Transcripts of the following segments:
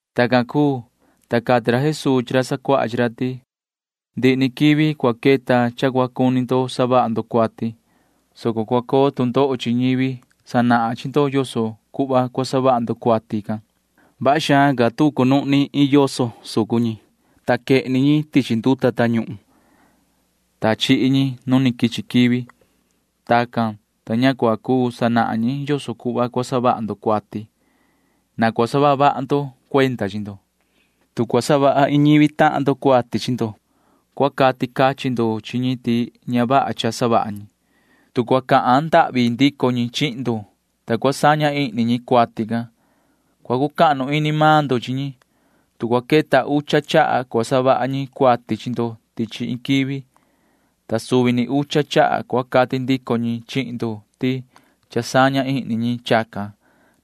Tacan cuu, ta cati ra Jesuu chi ra sacuaha chi ra ti: ―Ndihi ni quivi cua queta cha cua cuni ndo savaha ndo cuati, soco cua coo tu ndoho chi ñivi sanahan chi ndo yoso cuhva cua savaha ndo cuati can. Vaha xaan ca tu ni chacunuhni iin yoso sucun ñi, ta quehni ñi tichi nduta tañuhun, [ta chihi ñi nu quichi quivi]. Tacan, ta ña cua cuu sanahan ñi yoso cuhva cua savaha ndo cuati. Na cua saha vaha ndo cuenda chi ndo. ’Tu cua savaha iin ñivi tahan ndo cuati chi ndo, cua cati cachin ndo chi ñi ti ña vaha cha savaha ñi. Tu cua cahan ndahvi ndico ñi chihin ndo, ta cua saña ihni ñi cuati can, cua cucahnu ini maan ndo chi ñi. Tu cua queta ucha chaha cua savaha ñi cuati chi ndo tichi iin nduvi, ta suvi ni ucha chaha cua cati ndico ñi chihin ndo ti cha saña ihni ñi chacan,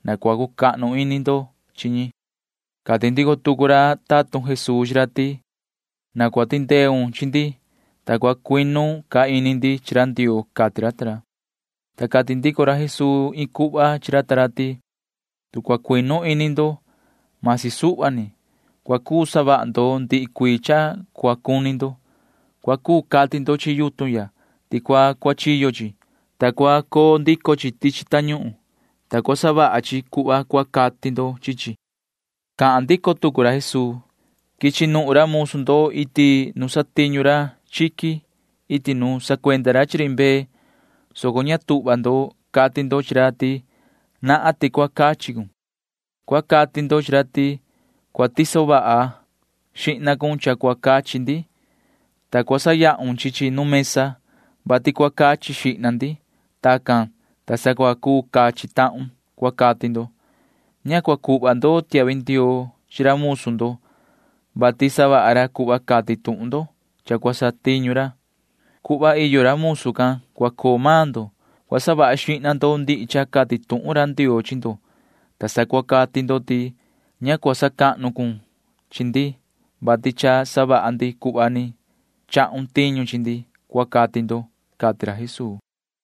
na cua cucahnu ini ndo chi ñi. Cati ndico tucu ra tatun Jesuu chi ra ti: ―Na cua tindeun chi ndi, ta cua cuinu ca ini ndi chi ra Ndioo ―cati ra ta ra. Ta cati ndico ra Jesuu iin cuhva chi ra ta ra ti: ―Tu cua cuinu ini ndo―masi suhva ni, cua cuu savaha ndo ndihi cuii cha cua cuni ndo. Cua cuu cati ndo chi yutun ya ti cua cuachiyo chi, ta cua coo ndico chi tichi tañuhun, ta cua savaha chi cuhva cua cati ndo chi chi. [Cahan ndico tucu ra Jesuu:] ’Quichi nuhun ra musu ndo iti nu satiñu ra chiqui iti nu sacuenda ra chi ri mbee, soco ña tuhva ndo cati ndo chi ra ti: “Nahan ti cua cachi cun.” Cua cati ndo chi ra ti: “Cua tiso vaha xihna cun cha cua cachi ndi, ta cua sayahun chi chi nu mesa, vati cua cachi xihna ndi. Tacan, ta sa cua cuu cachi tahun,” cua cati ndo. Ña cua cuhva ndo tiahvi ndioo chi ra musu ndo, vati savaha ra cuhva cati tuhun ndo cha cua satiñu ra. Cuhva iyo ra musu can cua coo maan ndo. Cua savaha xihna ndo ndihi cha cati tuhun ra Ndioo chi ndo, ta sa cua cati ndo ti: “Ña cua sacahnu cun chi ndi, vati cha savaha ndi cuhva ni chahun tiñu chi ndi,” cua cati ndo ―cati ra Jesuu.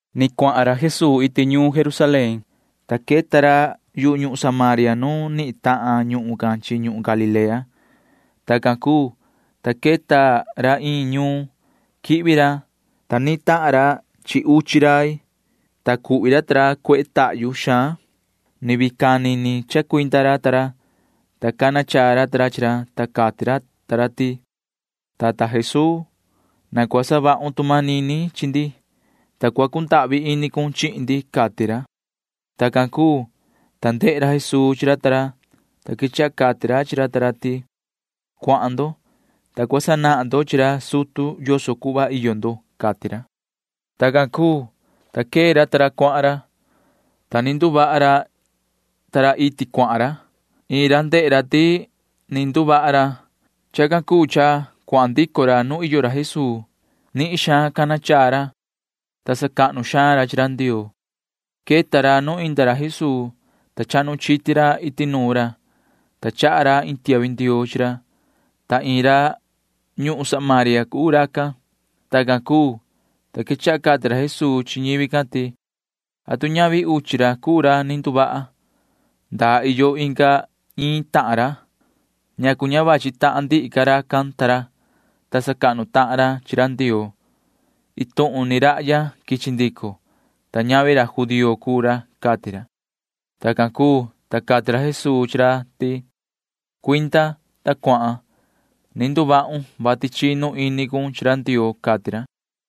Ni cuahan ra Jesuu iti ñuun Jerusalén, ta queta ra yu ñuhun Samaria nu nihin tahan ñuhun can chi ñuhun Galilea. Tacan cuu, ta queta ra iin ñuun. Quihvi ra, ta ni natahan ra chi uchi rai, ta cuhvi ra ta ra cuehe tahyu xaan. Ni vii cani ni chacuinda ra ta ra, ta cana chaa ra ta ra chi ra, ta cati ra ta ra ti: ―Yoho tata Jesuu, [na cua savahun tu manini chi ndi,] ta cua cundahvi ini cun chihin ndi ―cati ra. Tacan cuu, ta ndehe ra Jesuu chi ra ta ra, ta quechaha cati ra chi ra ta ra ti: ―Cuahan ndo, ta cua sanahan ndo chi ra sutu yoso cuhva iyo ndo ―cati ra. Tacan cuu, ta quee ra ta ra cuahan ra, ta ni nduvaha ra iti cuahan ra. Iin ra ndehe ra ti ni nduvaha ra. Chacan cuu cha cuahan ndico ra nu iyo ra Jesuu. Nihin xaan cana chaa ra, ta sacahnu xaan ra chi ra Ndioo. Queta ra nu inda ra Jesuu, ta chahnu chiti ra iti nuun ra, ta chaha ra iin tiahvi ndioo chi ra, ta iin ra ñuhun Samaria cuu racan. Tacan cuu, ta quechaha cati ra Jesuu chi ñivi can ti: ―¿Atu ñavi uchi ra cuu ra ni nduvaha? ¿Ndaa iyo inga iin tahan ra? ¿Ñacu ña vachi tahan ndihi ca racan ta ra, ta sacahnu tahan ra chi ra Ndioo? Iin tuhun ni rahya quichi ndico, ta ñavi ra judío cuu ra ―cati ra. Tacan cuu, ta cati ra Jesuu chi ra ti: ―Cuinda, ta cuahan. Ni nduvahun, vati chinu ini cun chi ra Ndioo ―cati ra.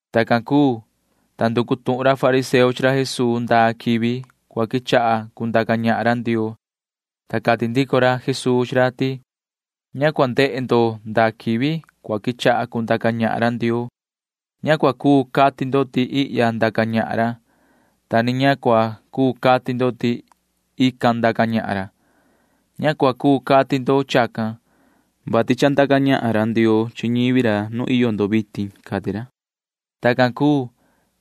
Tacan cuu, ta nducu tuhun ra fariseo chi ra Jesuu ndaa quivi cua quechaha cundaca ñahan ra Ndioo, ta cati ndico ra Jesuu chi ra ti: ―Ña cua ndehe ndo ndaa quivi cua quechaha cundaca ñahan ra Ndioo. Ña cua cuu cati ndo ti ihya ndaca ñahan ra, ta ni ña cua cuu cati ndo ti ican ndaca ñahan ra. Ña cua cuu cati ndo chacan, vati cha ndaca ñahan ra Ndioo chi ñivi ra nu iyo ndo vitin ―cati ra. Tacan cuu,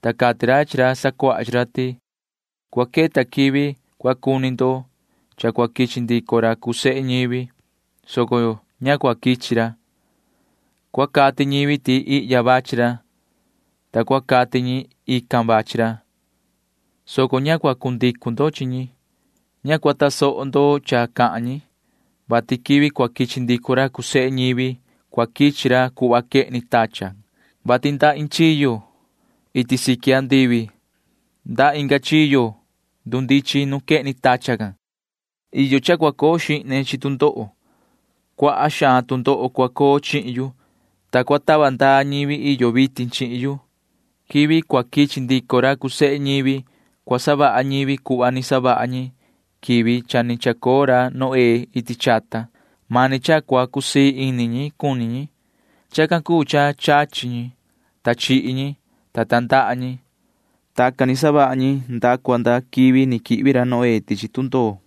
ta cati ra chi ra sacuaha chi ra ti: ―Cua queta quivi cua cuni ndo cha cua quichi ndico ra cuu sehe ñivi, soco ña cua quichi ra. Cua cati ñivi ti ihya vachi ra, ta cua cati ñi ican vachi ra, soco ña cua cundicu ndo chi ñi. Ña cua tasoho ndo cha cahan ñi, vati quivi cua quichi ndico ra cuu sehe ñivi cua quichi ra cuhva quehni tachan, vati nda iin chiyo iti siqui andivi nda inga chiyo ndundichin nu quehni tachan can. Iyo cha cua coo xihne chi tu ndoho. Cuaha xaan tu ndoho cua coo chihin yu, ta cua tava ndaa ñivi iyo vitin chihin yu. Quivi cua quichi ndico ra cuu sehe ñivi cua savaha ñivi cuhva ni savaha ñi quivi cha ni chacoo ra Noé iti chata. [Mani cha cua cusii ini ñi cuni ñi.] Chacan cuu cha chachi ñi, ta chihi ñi, ta tandaha ñi. Tacan ni savaha ñi nda cua nda quivi ni quihvi ra Noé tichi tundoo,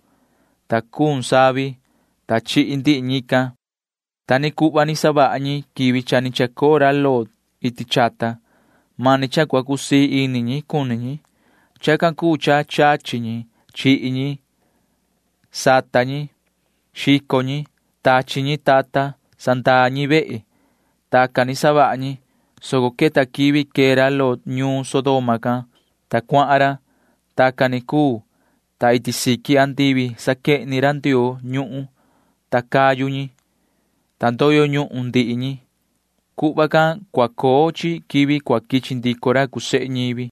ta cuun savi, ta chihi ndihi ñican. Ta ni cuhva ni savaha ñivi quivi cha ni chacoo ra Lot iti chata. [Mani cha cua cusii ini ñi cuni ñi.] Chacan cuu cha chachi ñi. Chihi ñi. Sata ñi. Xico ñi. Tachi ñi tata. Sandaa ñi vehe. Tacan ni savaha ñi, soco queta quivi quee ra Lot ñuun Sodoma can, ta cuahan ra. Tacan ni cuu, ta iti siqui andivi saquehni ra Ndioo ñuhun cayu ñi, ta ndoyo ñuhun ndihi ñi. Cuhva can cua coo chi quivi cua quichi ndico ra cuu sehe ñivi.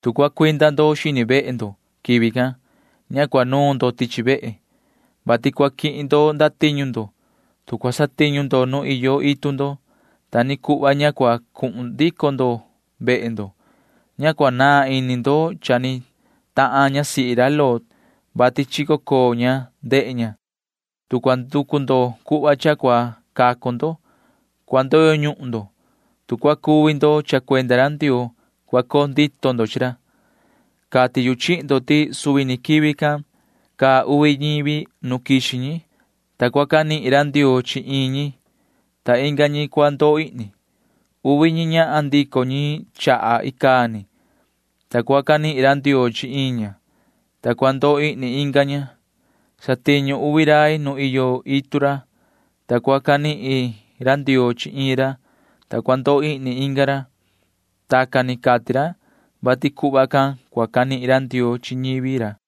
’Tu cua cuinda ndo xini vehe ndo quivi can, ña cua nuun ndo tichi vehe, vati cua quihin ndo ndatiñu ndo. Tu cua satiñu ndo nu iyo itu ndo, ta ni cuhva ña cua cuhun ndico ndo vehe ndo. Ña cua naan ini ndo cha ni tahan ñasihi ra Lot, [vati chico coo ña ndehe ña]. Tu cua nducu ndo cuhva cha cua cacu ndo, cua ndoyo ñuhun ndo. Tu cua cuvi ndo cha cuenda ra Ndioo, cua coo ndito ndo chi ra. ’Cati yu chihin ndo ti suvi ni quivi can caa uvi ñivi nu quixi ñi, ta cua canihin ra Ndioo chi iin ñi, ta inga ñi cua ndoo ihni. Uvi ñi ñahan ndico ñi chaha icaa ni, ta cua canihin ra Ndioo chi iin ña, ta cua ndoo ihni inga ña. Satiñu uvi rai nu iyo itu ra, ta cua canihin ra Ndioo chi iin ra, ta cua ndoo ihni inga ra. [Tacan ni cati ra, vati cuhva can cua canihin ra Ndioo chi ñivi ra.]